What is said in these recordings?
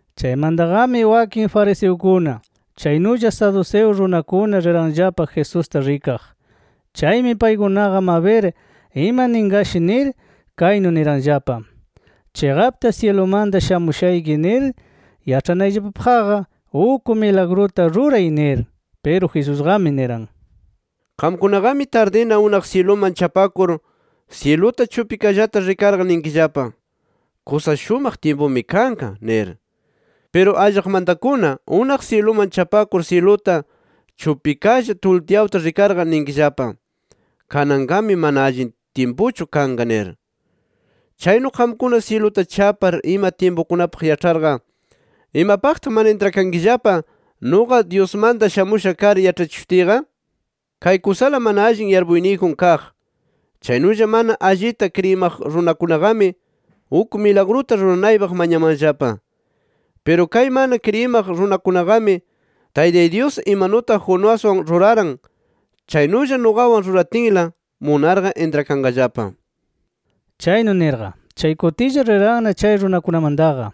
Chaymantaqami wakin fariseukuna, chaynulla saduceo runakuna riranllapa Jesusta rikaq. Chaymi paykunaqa mabir ima ninqashi nir, kaynu niranllapa: —Chiqapta syilumanta shamushayki nir yaĉhanayllapapaqqa uk milagruta ruray nir. Piru Jesusqami niran: —Qamkunaqami tardikuna unaq syiluman chapakur, syiluta chupikallata rikarqa ninkillapa: ‘Kusa shumaq tyimpumi kanqa’ nir. Piru allaqmantakuna unaq syiluman chapakur syiluta chupikalla tultyawta rikarqa ninkillapa: ‘Kananqami mana allin tyimpuchu kanqa’ nir. Chaynu qamkuna syiluta chapar ima tyimpukunapaq yaĉharqa, ¿imapaqtaq mana intrakankillapa nuqa Dyusmanta shamusha kar yaĉhachishutiyqa? Kay kusala mana allin yarpuyniyjun kaq, chaynulla mana allita kriyimaq runakunaqami uk milagruta ruranaypaq mañamanllapa. Piru kay mana kriyimaq runakunaqami Taytay Dyus imanutaq Jonaswan ruraran chaynulla nuqawan ruratinla, munarqa intrakanqallapa. Chaynu nirqa chay kutilla, riranna chay runakunamantaqa.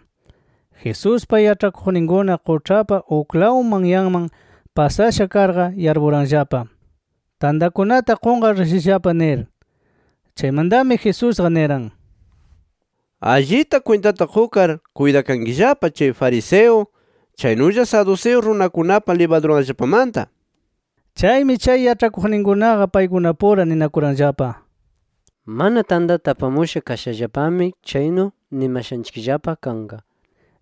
Jesuspa yaĉhakuqninkuna quĉhapa uklaw manyanman pasasha karqa yarpuranllapa, tantakunata qunqar rishallapa nir. Chaymantami Jesusqa niran: —Allita kwintata qukar, kuytakankillapa chay fariseo, chaynulla saduceo runakunapa libaduranllapamanta nir. Chaymi chay yaĉhakuqninkunaqa paykunapura ninakuranllapa: “¡Mana tantata apamusha kashallapami, chaynu nimashanchikllapa kanqa!” nir.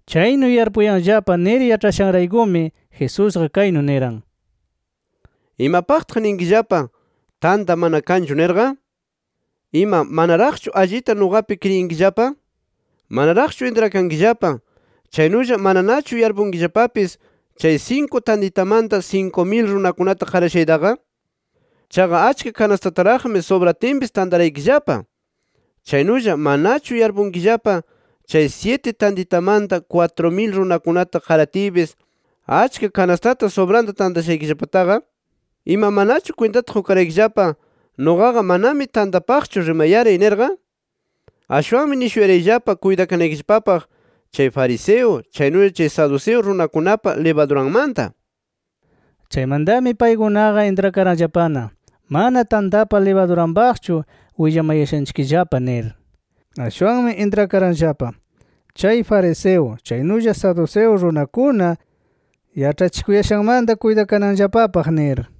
Chaynu yarpuyanllapa nir yaĉhayashanraykumi, Jesusqa kaynu niran: —¿Imapaqtaq ninkillapa, tanta mana kanchu nirqa? ¡Ima manaraqchu allita nuqapi kriyinkillapa! ¿Manaraqchu intrakankillapa, chaynulla mananachu yarpunkillapapis, chay sinku tantitamanta sinku mil runakunata qarashaytaqa? Chaqa achka kanastataraqmi subratinpis tantaraykillapa. Chaynulla manachu yarpunkillapa chay syiti tantitamanta kwatru mil runakunata qaratiypis, achka kanastata subranta tantashaykillapataqa. ¿Ima manachu kwintata qukaraykillapa, nuqaqa manami tantapaqchu rimayaray nirqa? Ashwanmi nishuyarayllapa kuytakanaykillapapaq chay fariseo, chaynulla chay saduceo runakunapa libaduranmanta. Chaymantami paykunaqa intrakaranllapana mana tantapa libaduranpaqchu willamayashanchikllapa nir. Ashwanmi intrakaranllapa chay fariseo, chaynulla saduceo runakuna yaĉhachikuyashanmanta kuytakananllapapaq nir.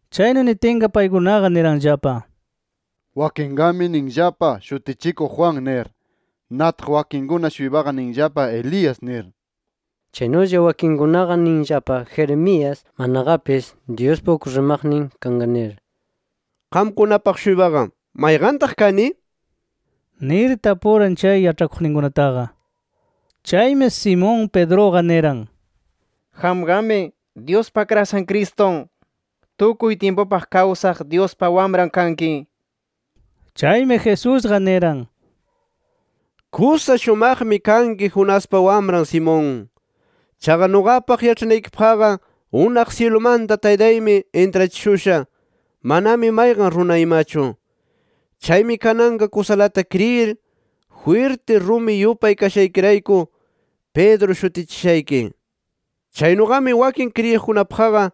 Chaynu nitinqa paykunaqa niranllapa: —Wakinqami ninllapa, Shutichikuq Juan nir. Nataq wakin-shuypaqa ninllapa Elías nir. Chaynulla wakinkunaqa ninllapa Jeremías, manaqapis Dyuspa uk rimaqnin kanqa nir. —Qamkunapaq-shuypaqa ¿mayqantaq kani? —nir tapuran chay yaĉhakuqninkunataqa. Chaymi Simón Pedruqa niran: —Qamqami Dyuspa Akrashan Cristun, tukuy tyimpupaq kawsaq Dyuspa Wamran kanki, nir. Chaymi Jesusqa niran: —Kusa shumaqmi kanki Jonaspa wamran Simón. Chaqa nuqapaq yaĉhanaykipaqqa unaq syilumanta Taytaymi intrachishusha, manami mayqan runa imachu. Chaymi kananqa kusalata kriyir, jwirti rumi yupay kashaykirayku Pedro shutichishayki. Chaynuqami wakin kriyiqkunapaqqa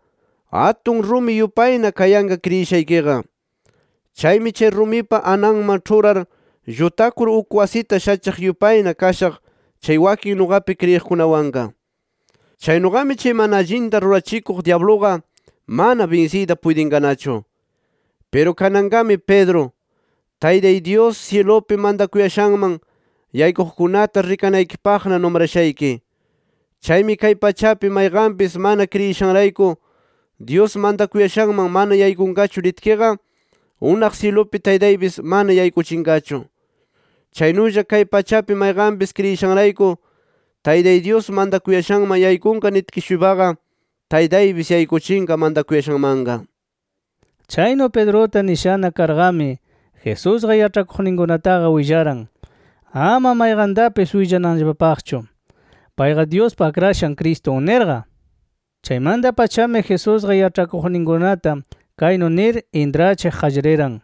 atun rumi yupayna kayanqa kriyishaykiqa. Chaymi chay rumipa ananman ĉhurar llutakur uk wasita shachiq yupayna kashaq chay wakin nuqapi kriyiqkunawanqa. Chaynuqami chay mana allinta rurachikuq dyabluqa mana binsiyta puytinqanachu. Piru kananqami Pedro, Taytay Dyus syilupi mantakuyashanman yaykuqkunata rikanaykipaqna numrashayki. Chaymi kay pachapi mayqanpis mana kriyishanrayku, Dyus mantakuyashanman mana yaykunqachu nitkiqa, unaq syilupi Taytaypis mana yaykuchinqachu. Chaynulla kay pachapi mayqanpis kriyishanrayku Taytay Dyus mantakuyashanman yaykunqa nitki-shuypaqa, Taytaypis yaykuchinqa mantakuyashanmanqa. Chaynu Pedruta nishana karqami Jesusqa yaĉhakuqninkunataqa willaran, ama mayqantapis willananllapapaqchu, payqa Dyuspa Akrashan Cristun nirqa. Chaymanta-pachami Jesusqa yaĉhakuqninkunata kaynu nir intrachiq qallariran: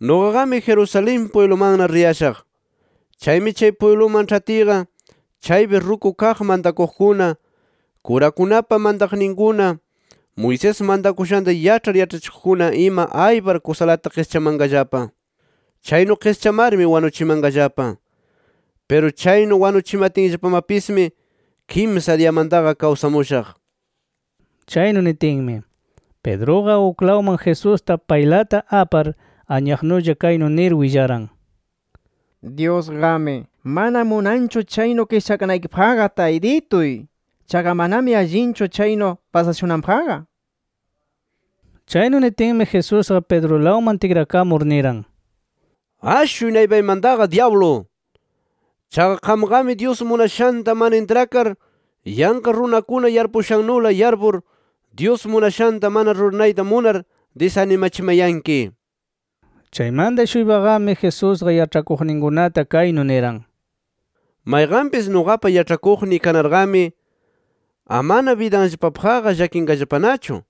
“Nuqaqami Jerusalén pwiblumanna riyashaq. Chaymi chay pwibluman ĉhatiyqa, chaypi ruku kaq mantakuqkuna, kurakunapa mantaqninkuna, Moisés mantakushanta yaĉhar yaĉhachikuqkuna ima aypar kusalata qischamanqallapa. Chaynu qischamarmi wanuchimanqallapa. Piru chaynu wanuchimatinllapamapismi kimsa diyamantaqa kawsamushaq” nir. Chaynu nitinmi, Pedruqa uklawman Jesusta paylata apar anyaqnulla kaynu nir willaran: —¡Dyusqami mana munanqachu chaynu qischakanaykipaqqa Taytituy! ¡Chaqa manami allinchu chaynu pasashunanpaqqa! nir. Chaynu nitinmi Jesusqa Pedrulawman tikrakamur niran: —¡Ashuy naypaymantaqa dyablu! Chaqa qamqami Dyus munashanta mana intrakar, yanqa runakuna yarpushannula yarpur, Dyus munashanta mana ruranayta munar disanimachimayanki nir. Chaymanta-shuypaqami Jesusqa yaĉhakuqninkunata kaynu niran: “Mayqanpis nuqapa yaĉhakuqniy kanarqami amana bidanllapapaqqa llakinqallapanachu.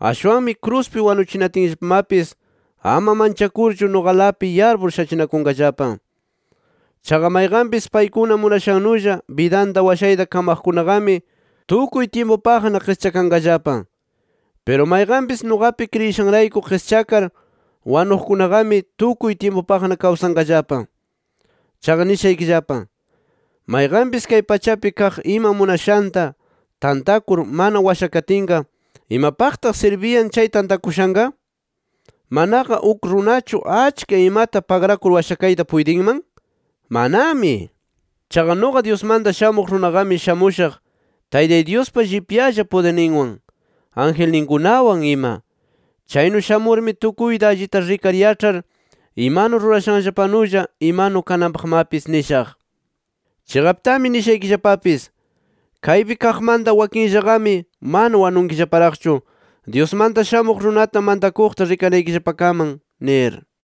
Ashwanmi kruspi wanuchinatinllapamapis ama manchakurchu nuqalapi yarpur shachinakunqallapa. Chaqa mayqanpis paykuna munashannulla bidanta washayta kamaqkunaqami tukuy tyimpupaqna qischakanqallapa. Piru mayqanpis nuqapi kriyishanrayku qischakar wanuqkunaqami tukuy tyimpupaqna kawsanqallapa. Chaqa nishaykillapa: Mayqanpis kay pachapi kaq ima munashanta tantakur mana washakatinqa, ¿imapaqtaq sirbiyan chay tantakushanqa? ¿Manaqa uk runachu achka imata pagrakur washakayta puytinman? ¡Manami! Chaqa nuqa Dyusmanta Shamuq Runaqami shamushaq Taytay Dyuspa llipyalla pudirninwan, angelniykunawan ima. Chaynu shamurmi tukuyta allita rikar yaĉhar imanu rurashanllapanulla imanu kananpaqmapis nishaq. Chiqaptami nishaykillapapis: Kaypi kaqmanta wakinllaqami mana wanunkillaparaqchu Dyusmanta Shamuq Runata mantakuqta rikanaykillapakaman nir”.